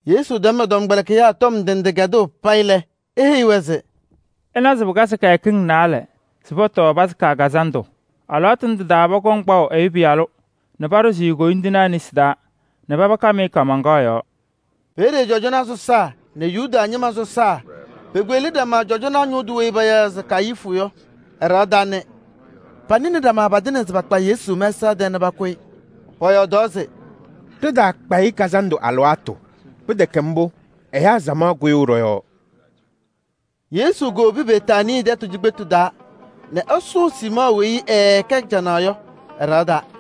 Yesu tɛm ɛ-tɔmkpɛlɩkɩyaa tɔm ndɩ ndɩ kɛdʋʋ payɩ lɛ, eheyi-wɛ se: “Ɩnawa se pɩkazɩ kɩyakɩŋ naalɛ se pɔtɔɔ Yomiye Taa Lɩʋ Kazandʋ. Alɩwaatʋ ndʋ tɩ-taa pɔkɔŋ kpaʋ Ɛyʋ Pɩyalʋ nɛ paɖʋzɩ-ɩ koyindinaa nesi taa nɛ paba kam-ɩ kaamaŋkaɣ yɔɔ.” Peeye cɔjɔnaa sɔsaa nɛ Yuda ñɩma sɔsaa pekpeɣli ɖama cɔjɔnaa ñʋʋ tʋ weyi payaɣ se Kayifu yɔ, ɛ-ɖɩɣa taa nɛ panɩnɩ ɖama patɩŋa se pakpa Yesu mɛsaɣ tɛɛ nɛ pakʋ-ɩ. Pɔyɔɔdaɣ se: “Ɖɩtaakpa-ɩ kazandʋ alɩwaatʋ. Pɩtɛkɛ mbʋ, ɛyaa samaɣ kʋyʋʋ ɖɔ-yɔɔ.” Yesu kowobi Betaanii tɛtʋ cikpetu taa nɛ ɛsʋʋ Siimɔɔ weyi ɛɛkɛ canaɣ yɔ ɛ-ɖɩɣa taa.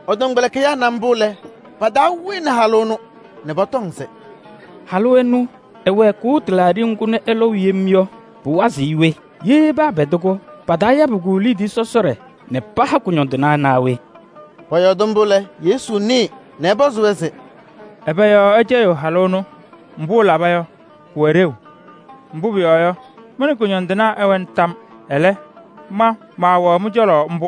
Ɛ-tɔmkpɛlɩkɩyaa na mbʋ lɛ, pa-taa wɩnɩ halʋ ɛnʋ nɛ pɔtɔŋ se: “Halʋ ɛnɛ, ɛwɛɛkʋʋ tɩlaaɖɩ ŋgʋ nɛ ɛlɔʋ yem yɔ, pʋwazɩɣ-ɩ we? Ye paapɛdɩ-kʋ, pataayabɩ-kʋ liidiye sɔsɔɖɛ nɛ paha kʋñɔndɩnaa naa we?” Pɔyɔɔdɩ mbʋ lɛ, Yesu nɩɩ nɛ ɛpɔzɩ-wɛ se: “Ɛbɛ yɔɔ ɩcɛyɩɣ halʋ ɛnʋ mbʋ? Mbʋ ɛlabɩ-m yɔ, pʋwɛ ɖeu. Mbʋ pʋyɔɔ yɔ, mɩ nɛ kʋñɔndɩnaa ɩwɛna. Ɛlɛ, ma maawɛɣ mɩ-cɔlɔ mbʋ.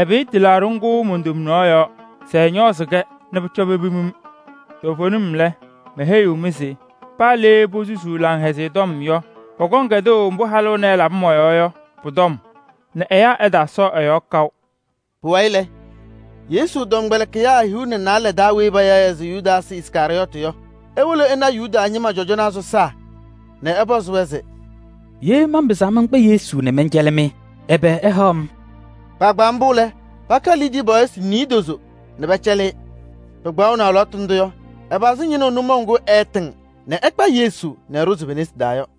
Ɛpɩyɩ tɩlaaɖɩ ŋgʋ mon-tomnaɣ yɔɔ se ɛñɔɔzɩ-kɛ nɛ pʋcɔ pepim-m. Toovenim lɛ, meheyiɣ-mɩ se: paa le posusuu Laŋhɛzɩyɛ Tɔm yɔ, pɔkɔŋ kɛdʋʋ mbʋ halʋ ɛnɛ ɛlabɩ mɔ-yɔɔ yɔ pʋ-tɔm nɛ ɛyaa ɛtaasɔɔ ɛ-yɔɔ kaʋ.” Pʋwayɩ lɛ, Yesu tɔmkpɛlɩkɩyaa hiu nɛ naalɛ taa weyi payaɣ se Yudaasɩ Iskarɩyɔɔtɩ yɔ, ewolo ɛna Yuda ñɩma cɔjɔnaa sɔsaa nɛ ɛpɔzɩ-wɛ se: “Ye manpɩzaa mankpa Yesu nɛ mɛncɛlɩ-mɩ, ɛbɛ ɩhaɣ-m?” Kpaagbaa mbʋ lɛ, pakalɩ liidiye pɔɔyɩsɩ niidozo nɛ pɛcɛlɩ-ɩ. Pɩkpaɣʋnɩ alɩwaatʋ ndʋ yɔ, ɛpazɩ ñɩnʋʋ nʋmɔʋ ŋgʋ ɛɛtɩŋ nɛ ɛkpa Yesu nɛ ɛɖʋzɩ pe-nesi taa yɔ.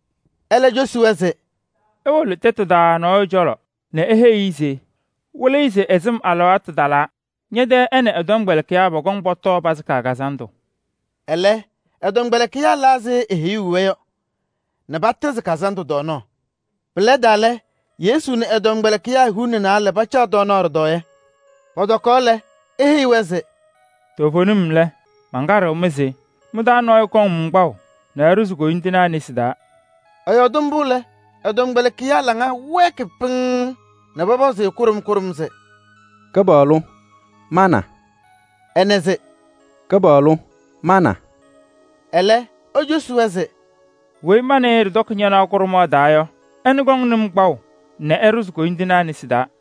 Ɛlɛ, ecosi-wɛ se: “Iwolo tɛtʋ taa nɔɔyʋ cɔlɔ nɛ iheyi-i se Wɩlɩyʋ se ɛ-sɩm alɩwaatʋ talaa, ñɛ-tɛ ɛ nɛ ɛ-tɔmkpɛlɩkɩyaa pɔkɔŋ pɔtɔɔ Yomiye Taa Lɩʋ Kazandʋ.” Ɛlɛ ɛ-tɔmkpɛlɩkɩyaa la ɛzɩ eheyuu-wɛ yɔ nɛ patɩzɩ kazandʋ tɔɔnaɣ. Pɩlɛdaa lɛ, Yesu nɛ ɛ-tɔmkpɛlɩkɩyaa hiu nɛ naalɛ pacaɣ tɔɔnaɣ ɖɩtɔɔyɛ. Pɔtɔkaɣ lɛ, eheyi-wɛ se: “Toovenim lɛ, mankaɖɩɣ-mɩ se: mɩ-taa nɔɔyʋ kɔŋ-m kpaʋ nɛ ɛɖʋzɩ koyindinaa nesi taa.” Ɛyɔɔdɩ mbʋ lɛ, ɛ-tɔmkpɛlɩkɩyaa laŋa wɛɛkɩ pɩŋŋ nɛ pɔpɔzʋʋ-ɩ kʋɖʋm kʋɖʋm se: “Kɩpaɣlʋ! Ma na?” Ɛnɛ se: “Kɩpaɣlʋ! Ma na?” Ɛlɛ ecosi-wɛ se: “Weyi ma nɛ ɩ ɖɩtɔkɩ ñanaɣ kʋɖʋmaɣ taa yɔ, ɛnʋ kɔŋnɩ-m kpaʋ nɛ ɛɖʋzɩ koyindinaa nesi taa.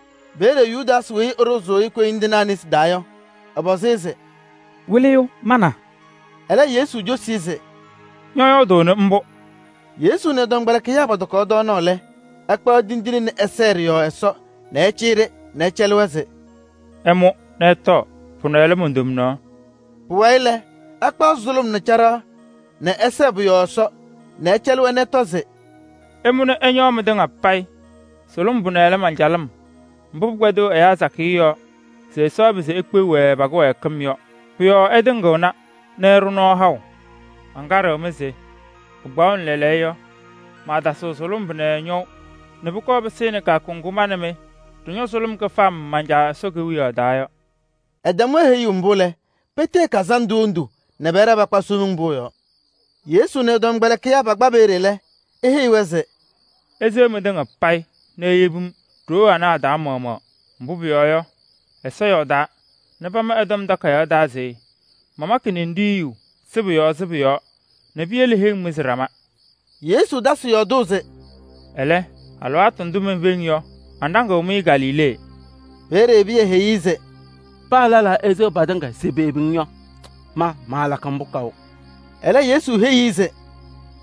Peeye Yudaasɩ weyi ɛɖʋzʋʋ-ɩ koyindinaa nesi taa yɔ, ɛpɔzɩ-ɩ se: “Wɩlɩyʋ! Ma na?” Ɛlɛ, Yesu cosi-i se: “Ñɔyɔɔdʋʋnɩ mbʋ.” Yesu nɛ ɛ-tɔmkpɛlɩkɩyaa pɔtɔkaɣ tɔɔnaɣ lɛ, ɛkpaɣ tindine nɛ ɛsɛɛ ɖɩ-yɔɔ Ɛsɔ nɛ ɛcɩyɩ-ɖɩ nɛ ɛcɛlɩ-wɛ se: “Ɩmʋ nɛ ɩtɔɔ, pʋnɛ lɛ mon-tomnaɣ.” Pʋwayɩ lɛ, ɛkpaɣ sʋlʋm nɛ caɖaɣ nɛ ɛsɛɛ pʋ-yɔɔ Ɛsɔ nɛ ɛcɛlɩ-wɛ nɛ ɛtɔ se: “Ɩmʋ nɛ ɩñɔɔ mɩtɩŋa payɩ. Sʋlʋm pʋnɛ lɛ man-calɩm mbʋ pɩkpɛdɩɣ ɛyaa sakɩyɛ yɔɔ se Ɛsɔ ɛpɩzɩ ekpeɣ-wɛ pa-kɩwɛɛkɩm yɔ. Pʋ-yɔɔ ɛtɩŋɩɣna nɛ ɛɖʋ nɔɔ haʋ. Mankaɖɩɣ-mɩ se pɩkpaɣʋnɩ lɛɛlɛɛyɔ yɔ, maatasɩɣ sʋlʋm ñɔʋ nɛ pʋkɔɔ pɩsɩnɩ kɩyakʋ ŋgʋ ma nɛ mɩ ɖɩñɔ kɩfam man-Caa Ɛsɔ Kewiyaɣ taa yɔ.” Ɛtɛm-wɛ heyuu mbʋ lɛ, petee kazandʋ hendu nɛ pɛɖɛɛ pakpa Somiŋ Pʋʋ yɔɔ. Yesu nɛ ɛ-tɔmkpɛlɩkɩyaa pakpa peeye lɛ, eheyi-wɛ se: “Iseɣ mɩtɩŋa payɩ nɛ iyebi-m ɖoo anɛ a-taa maɣmaɣ. Mbʋ pʋyɔɔ yɔ, Ɛsɔ yɔɔdaa se: ‘Mamakɩ ninɖiɣyu sɩbʋ yɔɔ sɩbʋ yɔɔ nɛ piyele heŋ mɩzɩ ɖama.’ Ndʋ pama ɛ-Tɔm Takayaɣ taa. Ɛlɛ, alɩwaatʋ ndʋ menfeŋ yɔ, manɖaŋɩɣ-mɩ Galilee.” Peeye Pɩyɛ heyi-i se: “Paa lɛlaa eseɣ patɩŋa se peyebi-ŋ yɔ, ma maalakɩ mbʋ kaʋ!” Ɛlɛ Yesu heyi-i se: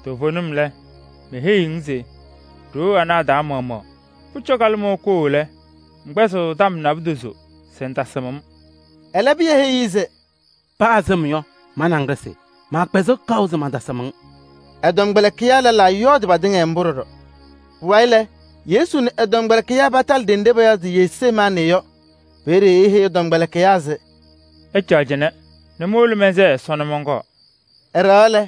“Toovenim lɛ, meheyiɣ-ŋ se ɖoo anɛ a-taa maɣmaɣ, pʋcɔ kalɩmɔʋ koo lɛ, ŋkpɛzɩɣ tɔm naadozo se ŋtasɩm-m.” Ɛlɛ, Pɩyɛ heyi-i se: “Paa sɩm yɔ, ma nɛ ŋ ɖɩsɩ, maakpɛzɩɣ kaʋ se mantasɩm-ŋ.” Ɛ-tɔmkpɛlɩkɩyaa lɛlaa yɔɔdɩ patɩŋa mbʋ ɖɔɖɔ. Pʋwayɩ lɛ, Yesu nɛ ɛ-tɔmkpɛlɩkɩyaa patalɩ ɖenɖe payaɣ se Jesemaanɩ yɔ. Peeye eheyi ɛ-tɔmkpɛlɩkɩyaa se: “Ɩcaɣ cɩnɛ nɛ mowolo mɛnsɛɛ Ɛsɔ nɛ mɔnkɔɔ.” Ɛɖɛɣaɣ lɛ,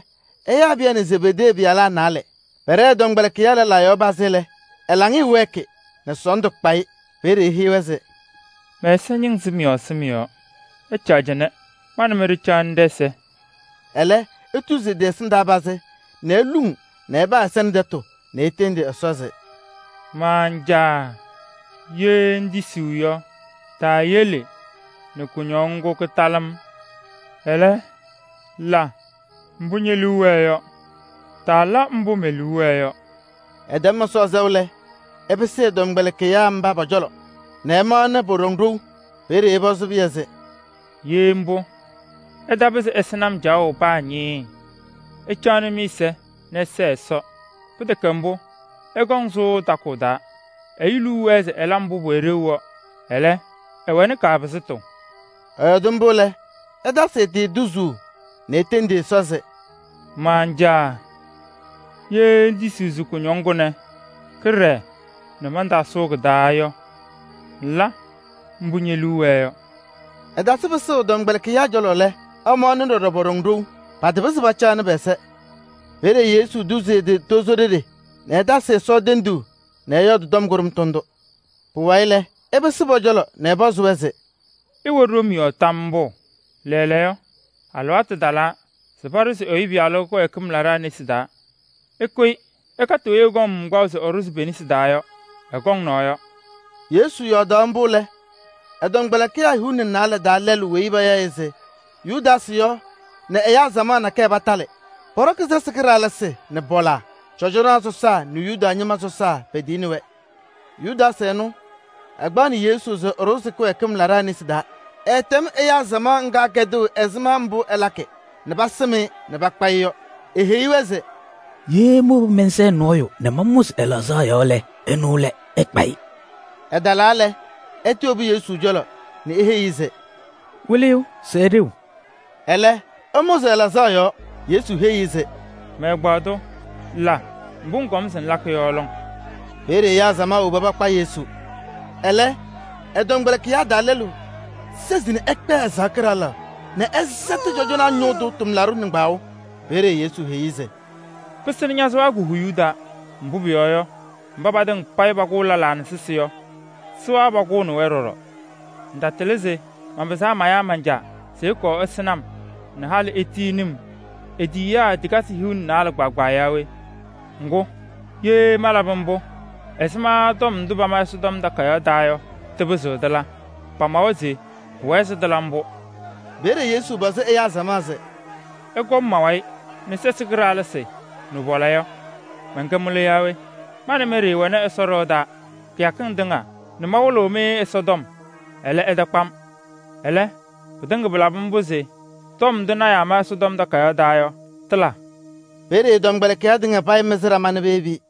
ɛyaa Pɩyɛ nɛ Zebedee pɩyalaa naalɛ. Pɛɖɛ tɔmkpɛlɩkɩyaa lɛlaa yɔɔ pazɩ lɛ, ɛ-laŋɩyɛ wɛɛkɩ nɛ sɔɔndʋ kpa-ɩ. Peeye eheyi-wɛ se: “Mɛ-ɛza ñɩŋ sɩm yɔɔ sɩm yɔɔ. Ɩcaɣ cɩnɛ, ma nɛ mɩ ɖɩcaɣnɩ ɖɛ-ɛza.” Ɛlɛ etuzi ɛ-tɩ ɛsɩndaa pazɩ nɛ eluŋ nɛ ɛpa ɛ-ɛza nɛ tɛtʋ nɛ etendi Ɛsɔ se: “Man-Caa! Ye ŋtisiɣ yɔ, taayele nɛ kʋñɔŋ ŋgʋ kɩtalɩ-m. Ɛlɛ, la mbʋ ñe-liu wɛɛ yɔ, taala mbʋ me-liu wɛɛ yɔ.” Ɛtɛm Ɛsɔ sɛʋ lɛ, ɛpɩsɩ ɛ-tɔmkpɛlɩkɩyaa mba pɔ-cɔlɔ nɛ ɛmaɣnɩ pɔɖɔŋ ɖou. Peeye ɛpɔzɩ Pɩyɛ se: “Ye mbʋ, ɩtapɩzɩ ɩsɩnɩ-m caɣʋ paa ñɩɩɩ! Ɩcaɣnɩ mɩ-ɛza nɛ ɩsɛɛ Ɛsɔ, pɩtɛkɛ mbʋ, ɩkɔŋ ɩsʋʋ takʋʋ taa. Ɛyʋ liu wɛɛ se ɛla mbʋ pʋwɛ ɖeu yɔ, ɛlɛ, ɛwɛnɩ kaapɩzɩtʋ.” Ɛyɔɔdɩ mbʋ lɛ, ɛtasɩ ɛ-tɩ tuzuu nɛ etendi Ɛsɔ se: “Man-Caa! Ye ŋŋtisiɣ se kʋñɔŋ kʋnɛ kɩɖɛɛ nɛ mantaasʋʋ kɩ-taa yɔ, ŋla mbʋ ñe-liu wɛɛ yɔ.” Ɛtasɩ pɩsʋʋ ɛ-tɔmkpɛlɩkɩyaa cɔlɔ lɛ, ɛmaɣnɩ ɖɔɖɔ pɔɖɔŋ ɖou, patapɩzɩ pacaɣnɩ pɛ-ɛza. Peeye Yesu tuzi ɛ-tɩ tozo ɖeɖe nɛ ɛtasɩ Ɛsɔ tenduu nɛ ɛyɔɔdɩ tɔm kʋɖʋmtʋ ndʋ. Pʋwayɩ lɛ, ɛpɩsɩ pɔ-cɔlɔ nɛ ɛpɔzɩ-wɛ se: “Ɩwɛ ɖom yɔɔ tam mbʋ? Lɛɛlɛɛyɔ, alɩwaatʋ talaa se paɖʋzɩ Ɛyʋ Pɩyalʋ kɩwɛɛkɩm laɖaa nesi taa. Ɩkʋyɩ ɖɩkatɩ weyi ɛkpaɣ-m se ɛɖʋzɩ pe-nesi taa yɔ! Ɛkɔŋ naɣ yɔ!” Yesu yɔɔdaɣ mbʋ lɛ, ɛ-tɔmkpɛlɩkɩyaa hiu nɛ naalɛ taa lɛlʋ weyi payaɣ-ɩ se Yudaasɩ yɔ nɛ ɛyaa samaɣ nakɛyɛ patalɩ. Pɔɖɔkɩ sɛsɩ kɩɖaɣlɩsɩ nɛ pɔla. Cɔjɔnaa sɔsaa nɛ Yuda ñɩma sɔsaa petiyini-wɛ. Yudaasɩ ɛnʋ, ɛkpaɣnɩ Yesu se ɛɖʋzɩ kɩwɛɛkɩm laɖaa nesi taa. Ɛɛtɛm ɛyaa samaɣ ŋga kɛdʋʋ ɛzɩma mbʋ ɛlakɩ nɛ pasɩm-ɩ nɛ pakpa-ɩ yɔ. Eheyi-wɛ se: “Ye mowobi mɛnsɛɛ nɔɔyʋ nɛ mamʋzɩ ɛ-laɣzaɣ yɔɔ lɛ, ɛnʋ lɛ. Ɩkpa-ɩ.” Ɛtalaa lɛ, ɛtɩwobu Yesu cɔlɔ nɛ eheyi-i se: “Wɩlɩyʋ, sɛɛ ɖeu!” Ɛlɛ ɛmʋzɩ ɛ-laɣzaɣ yɔɔ. Yesu heyi-i se: “Mɛ-ɛgbaadʋ, la mbʋ ŋkɔm se ŋlakɩ yɔ lɔŋ!” Peeye ɛyaa samaɣ woba kakpa Yesu. Ɛlɛ ɛ-tɔmkpɛlɩkɩyaa taa lɛlʋ sezi ɛkpɛɛ ɛ-sɩɣa kɩɖaɣlaɣ nɛ ɛsɛtɩ cɔjɔnaa ñʋʋ tʋ tʋmlaɖʋ nɩŋgbaŋʋʋ. Peeye Yesu heyi-i se: “Pɩsɩnɩ ña-sɩɣa ko-huyuu taa, mbʋ pʋyɔɔ yɔ, mba patɩŋa payɩ pakʋʋ lɛlaa nɛ sɛsɩ yɔ, sɩɣa pakʋʋnɩ-wɛ ɖɔɖɔ. Ŋtatɩlɩ se manpɩzaɣ se mayaa man-Caa se ɛkɔɔ ɛsɩnɩ-m nɛ halɩ etiyini-m e-tiyiyaa tikasɩ hiu nɛ naalɛ kpaagbaa yaa we? Ŋgʋ, ye malabɩ mbʋ, ɛzɩma tɔm ndʋ pama Ɛsɔtɔm Takayaɣ taa yɔ, tɩpɩzɩɣ tɩla? Pamawa se pʋwɛɛ se tɩla mbʋ.” Peeye Yesu pɔzɩ ɛyaa samaɣ se: “Ɩkɔm ma-wayɩ nɛ sɛsɩ kɩɖaɣlɩsɩ nɛ pɔla yɔ, mɛnkɛ mɩlʋ naa we? Ma nɛ mɩ ɖɩɩwɛ Ɛsɔ ɖɩɣa taa kɩyakɩŋ tɩŋa nɛ mawɩlɩɣ Ɛsɔtɔm, ɛlɛ, ɩtakpa-m. Ɛlɛ, pɩtɩŋa pɩlabɩ mbʋ se tɔm ndʋ lɔɔyɩsɩ tɩnaa ma Ɛsɔtɔm Takayaɣ taa yɔ, tɩla.” Peeye ɛ-tɔmkpɛlɩkɩyaa tɩŋa payɩ mɩzɩ ɖama nɛ peyebi-i.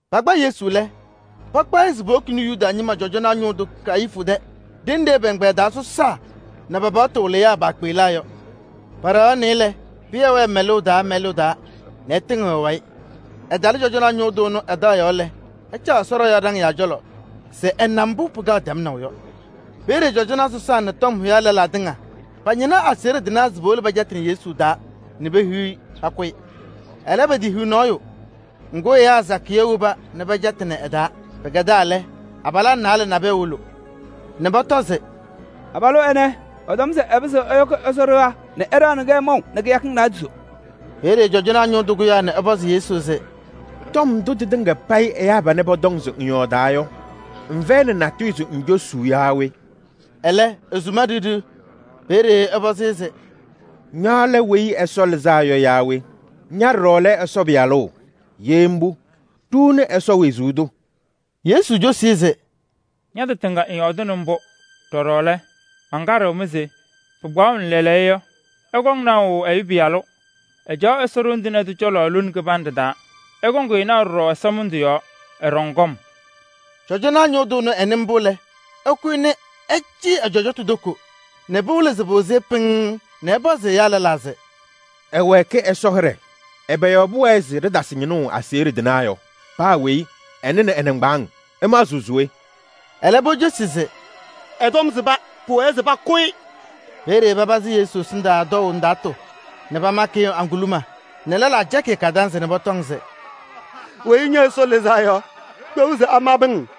Pakpa Yesu lɛ, pakpaɣ-ɩ se powokini-i Yuda ñɩma cɔjɔnaa ñʋʋ tʋ Kayifu tɛ ɖenɖe pɛ-ɛgbɛyɛ taa sɔsaa nɛ pa-paɣtʋ wɩlɩyaa paakpeɣlaa yɔ. Pɛɖɛɣaɣnɩ-ɩ lɛ, Pɩyɛ wɛɛ mɛlʋʋ taa mɛlʋʋ taa nɛ ɛtɩŋɩɣ ɛ-wayɩ. Ɛtalɩ cɔjɔnaa ñʋʋ tʋ ɛnʋ ɛ-taɣ yɔɔ lɛ, ɛcaɣ Ɛsɔ ɖɩɣa yɔɔ ɖaŋɩyaa cɔlɔ se ɛna mbʋ pʋkɔŋ tɛmnaʋ yɔ. Peeye cɔjɔnaa sɔsaa nɛ tɔm hʋyaa lɛlaa tɩŋa pañɩnaɣ aseɣɖe tɩnaa se powolo pɛcɛtɩnɩ Yesu taa nɛ pehiɣ-i pakʋ-ɩ. Ɛlɛ, petehiɣ nɔɔyʋ. Ŋgʋ, ɛyaa sakɩyɛ woba nɛ pɛcɛtɩnɩ ɛ-taa. Pɩkɛdaa lɛ, abalaa naalɛ nabɛyɛ wolo nɛ pɔtɔ se: “Abalʋ ɛnɛ, ɛtɔm se ɛpɩzɩɣ ɛyɔkɩ Ɛsɔ ɖɩɣa nɛ ɛɖaɣnɩ-kɛ maʋ nɛ kɩyakɩŋ naadozo.” Peeye cɔjɔnaa ñʋʋ tʋ kʋyaa nɛ ɛpɔzɩ Yesu se: “Tɔm ndʋ tɩtɩŋa payɩ ɛyaa panɛ pɔtɔŋ se ŋyɔɔdaa yɔ, ŋfɛyɩnɩ natʋyʋ se ŋcosuu yaa we?” Ɛlɛ, esuma ɖiɣ ɖiɣ. Peeye ɛpɔzɩ-ɩ se: “Ña lɛ Weyi Ɛsɔ Lɩzaa Yɔ yaa we? Ña ɖɔɖɔ lɛ Ɛsɔ Pɩyalʋ? Ye mbʋ, ɖuuni Ɛsɔ wezuu tʋ.” Yesu cosi-i se: “Ña-tɩ tɩŋa ŋyɔɔdɩnɩ mbʋ. Ɖɔɖɔ lɛ, mankaɖɩɣ-mɩ se: pɩkpaɣʋnɩ lɛɛlɛɛyɔ yɔ, ɩkɔŋ naʋ Ɛyʋ Pɩyalʋ, ɛcaɣ Ɛsɔ Ɖoŋ Tɩŋa Tʋ cɔlɔ lone kɩbanɖɛ taa. Ɩkɔŋ-ɩ naʋ ɖɔɖɔ ɛsɔmɩndʋ yɔɔ, ɛɖɔŋ kɔm.” Cɔjɔnaa ñʋʋ tʋ ɛnʋ, ɛnɩ mbʋ lɛ, ɛkʋyɩ nɛ ɛcɩyɩ ɛ-cɔjɔtʋ toko nɛ pɩwɩlɩ se pɩwɩzɩ-ɩ pɩŋŋ nɛ ɛpɔzɩ ɛyaa lɛlaa se: “Ɛwɛɛkɩ Ɛsɔ hɩɖɛ! Ɛbɛ yɔɔ pʋwɛɛ se ɖɩtasɩ ñɩnʋʋ aseɣɖe tɩnaa yɔ? Paa weyi ɛnɩnɩ ɛ-nɩŋgbaaŋ! Ɩmaɣzɩɣ se we?” Ɛlɛ pocosi se: “Ɛ-tɔm sɩba, pʋwɛɛ se pakʋ-ɩ.” Peeye papazɩ Yesu ɛsɩndaa tɔʋ ndaatʋ nɛ pamakɩ-ɩ ŋguluma nɛ lɛlaa cɛkɩ-ɩ kadanzɩ nɛ pɔtɔŋ se: “Weyi ña Ɛsɔ Lɩzaa Yɔ, kpeɣ se amabɩ-ŋ?”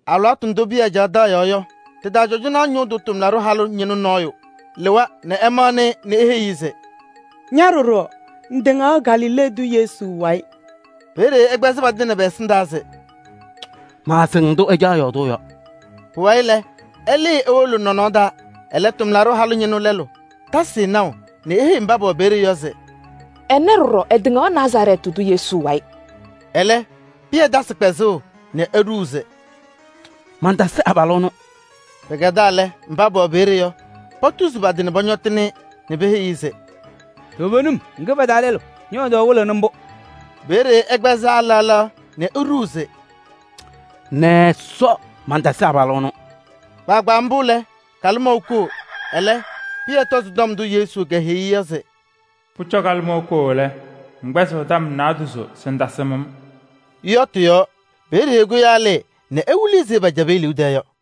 Alɩwaatʋ ndʋ Pɩyɛ caɣ taɣ yɔɔ yɔ, tɩ-taa cɔjɔnaa ñʋʋ tʋ tʋmlaɖʋ halʋ ñɩnʋ nɔɔyʋ lɩwa nɛ ɛmaɣnɩ-ɩ nɛ eheyi-i se: “Ña ɖɔɖɔ! Ŋtɩŋaɣ Galilee tʋ Yesu wayɩ.” Peeye ɛkpɛzɩ patɩŋa pɛ-ɛsɩndaa se: “Maasɩŋ ndʋ ŋcaɣ yɔɔdʋʋ yɔ.” Pʋwayɩ lɛ, ɛlɩɩ ewolo nɔnɔɔ taa. Ɛlɛ, tʋmlaɖʋ halʋ ñɩnʋ lɛlʋ tasɩ-ɩ naʋ nɛ eheyi mba pɛwɛ peeye yɔ se: “Ɛnɛ ɖɔɖɔ ɛtɩŋaɣ Nazarɛɛtɩ tʋ Yesu wayɩ.” Ɛlɛ, Pɩyɛ tasɩ kpɛzʋʋ nɛ eɖuu se: “Mantasɩ abalʋ ɛnʋ.” Pɩkɛdaa lɛ, mba pɛwɛ peeye yɔ, potuzi pa-tɩ nɛ pɔñɔtɩnɩ-ɩ nɛ peheyi-i se: “Toovenim, ŋkɛ pa-taa lɛlʋ: ñɔ-yɔɔdaɣ wɩlɩɣnɩ mbʋ.” Peeye ɛkpɛzaa laɣ laɣ nɛ eɖuu se: “Nɛ Ɛsɔ! Mantasɩ abalʋ ɛnʋ!” Kpaagbaa mbʋ lɛ, kalɩmɔʋ koo. Ɛlɛ Pɩyɛ tɔzɩ tɔm ndʋ Yesu keheyi-i se: “Pʋcɔ kalɩmɔʋ koo lɛ, ŋkpɛzɩɣ tɔm naadozo se ŋtasɩm-m” yɔ tɩ-yɔɔ. Peeye ɛkʋyaa ɛlɩɩ nɛ ewili ɛzɩ pɛcɛbɩ e-liu tɛɛ yɔ.